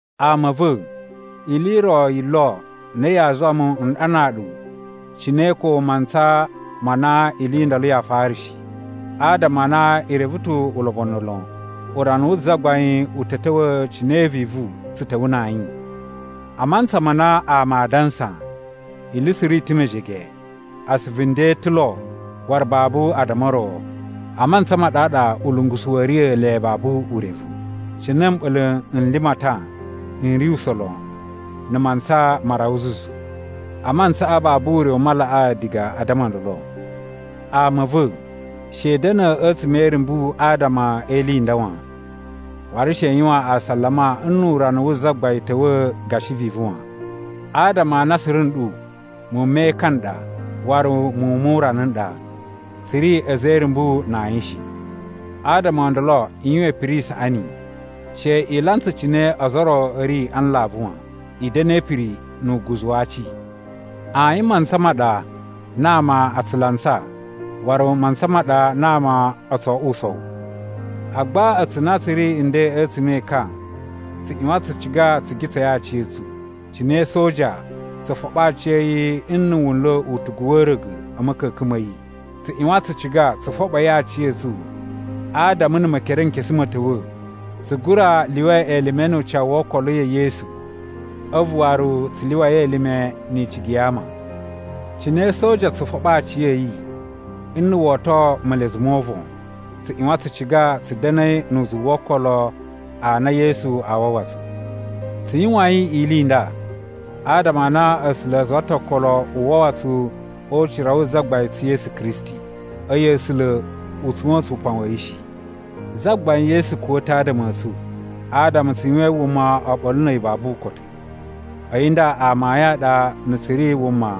Ama a̱ va̱, ili i ro yi lo na yaa zuwa mu n ɗanaa ɗu cine ko mantsa ma na ili i ndolo yaa fara shi, adama a na i reve ta̱ ulobonu lon urana wu Zagbain u ta̱ ta̱wa̱ cine vivu tsu ta̱wa̱ na ayin. A mantsa ma na ama aa dansa, “Ili suru i ta̱ mejege, asuvu nden ta̱ lo waru babu addama o ro,” a mantsa ma ɗaɗa ulungusu wa̱a̱ riya̱ le babu urevu, cine mɓa̱la̱ n limatan n ri usa̱n lon na̱ mantsa ma rawa zuzu. A mantsaꞌa babu ure u malaꞌaa diga a addama o ndolo. Ama a̱ va̱, she i da̱na̱ a̱tsuma̱ e irumbu adama e ili nda wan, waru she i yuwan asalama nnu urana wu Zagbain ta̱wa̱ gashi vivu wan. Adama a na suru nɗu muwun me ekan n ɗa waru muwun mu urana n ɗa. Tsu ri a̱za̱ e irumbu na ayin shi. Adama o ndolo i yuwan ipiri i saꞌani, she i lantsa cine ozo o ro a̱ ri a nlavu wan. I da̱na̱ e ipiri nu uguzu wa aci. Ayin mantsa ma ɗa na ama a tsu lantsa waru mantsa ma ɗa na ama o tso oꞌwo usowu. Agba a̱tsu na tsu ri a̱ nden a̱tsuma̱ e ekan tsu ꞌyuwan tsu ciga tsu gitsai aciya̱tsu. Cine soja tsu foɓo aciya̱yi nna̱ wu nla̱ utugu wa̱ a̱a̱ra̱ga̱ a̱ ma̱ka̱ka̱n ma yi, tsu ꞌyuwan tsu ciga tsu foɓoi aciya̱tsu adama na̱ Mekerenkesu ma̱ ta̱wa̱, tsu gura lyuwa elime nu ucawu wo okolo ya̱ Yesu a̱vu waru tsu lyuwai elime ni icigi ya ama. Cine soja tsu foɓo aciya̱yi nna̱ wo oto melezu mo uvon, tsu ꞌyuwan tsu ciga tsu da̱na̱i nu uzuwu wo okolo a na Yesu a wawa tsu. Tsu yuwain ili i nda adama a na A̱sula̱ a zuwa ta̱ okolo u wawa tsu o ucira wu Zagbain tsu Yesu Kristi. A̱yi A̱sula̱ u tsuwa̱n tsu upan wa̱ yi shi. Zagbain Yesu kuwa̱ ta̱ adama a̱ tsu, adama tsu yuwain wuma oɓolo na̱ a̱yi babu ukotu. A̱yi nda amayun a ɗa na̱ tsu ri wuma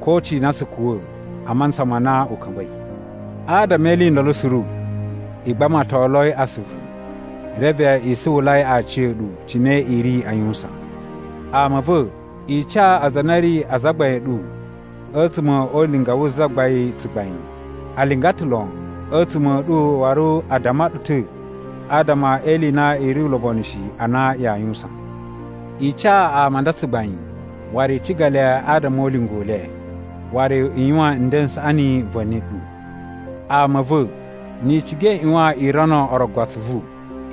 ko cina tsu kuwa̱ a mantsa ma na u ka̱mba̱i. Adama e ili i ndolo suru, i gbamatoloi asuvu reve i suwulai aciya̱ɗu cine i ri a yuwusan. Ama a̱ va̱, i ca aza a na a̱ ri azagbain a̱ ɗu a̱tsuma̱ o ulinga wu Zagbain tsugbain. A linga ta̱ lon a̱tsuma̱ a̱ ɗu waru a damma ɗu ta̱ adama e ili i na i ri ulobonu shi a na yaa yuwusan. I ca ama a nda tsugbain waru i ciga le adama o ulinga u le. Waru i yuwan nden n saꞌani va̱ni ɗu. Ama a̱ va̱, ni i ciga i ꞌyuwan i rono orogo atsuvu.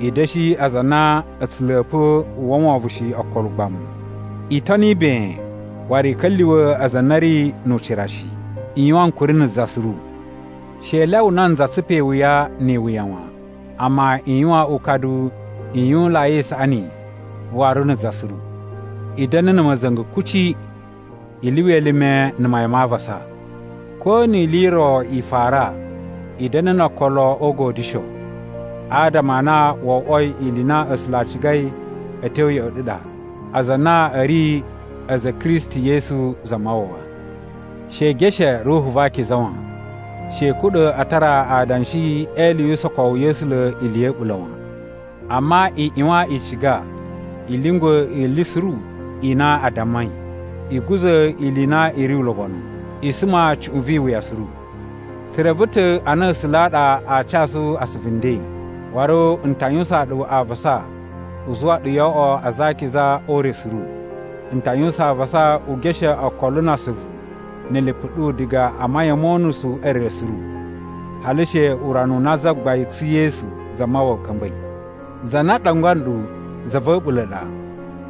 I da̱shi aza a na a̱ tsu la̱pa̱ uwwa wovon shi okolo ugbamu. I toni ben waru i ka̱lyuwa̱ aza a na a̱ ri nu ucira shi. I yuwan ankuri na̱ za suru. She i lyawa nanza tsupa iwuya ni iwuya wan, amma i yuwan ukadu i yuwunlai isaꞌani waru na̱ za suru. I da̱na̱ na̱ ma̱za̱nga̱ kuci. I lyuwa elime na̱ mayan ma avasa. Ko ni ili i ro i fara, i da̱na̱ na̱ no okolo o ugodyusho, adama a na wo oꞌwoi ili i na A̱sula̱ a cigai a̱ tyo ya̱ꞌa̱ ɗu ɗa aza a na a̱ ri a̱za̱ a̱ Kristi Yesu Zamawawa. She i geshe Ruhu va Akiza wan. She i kuɗa̱ a tara adanshi e ili yu usokowu ya̱ A̱sula̱ ili ya̱ a̱ɓula̱ wan. Amma i ꞌyuwan i ciga i lyungwa̱ ili suru i na a dammai. I guza̱ ili i na i ri ulobonu. I suma cuꞌun vi iwuya suru. Tsu reve ta̱ a na A̱sula̱ a ɗa aa casu asuvu nden, waru n ta yuwusaan ɗu avasa u zuwa ɗu yoo oꞌwo aza a akiza o ure suru. N ta yuwusan avasa u geshe okolo na asuvu na̱ lipu ɗu diga a mayan mo unusu e re suru, hali she urana u na Zagbain tsu Yesu Zamawawa ka̱mba̱i. Za na ɗangwa nɗu za va̱ a̱ɓula̱ ɗa,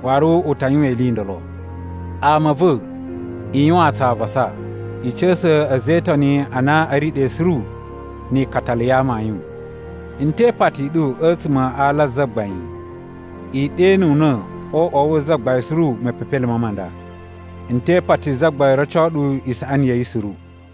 waru u ta yuwan ili i ndolo. Ama a̱ va̱, i yuwaan tsu avasa. I ca̱sa̱ a̱za̱ e Itoni a na a̱ ri ɗe suru ni ikatalu ya amayun. N te ipati i ɗu a̱tsuma̱ a ala a Zagbain, i ɗenuna̱ o uꞌwa wu Zagbain suru mepepelime ma nda. N te ipati Zagbain roco ɗu isaꞌani ya̱ yi suru.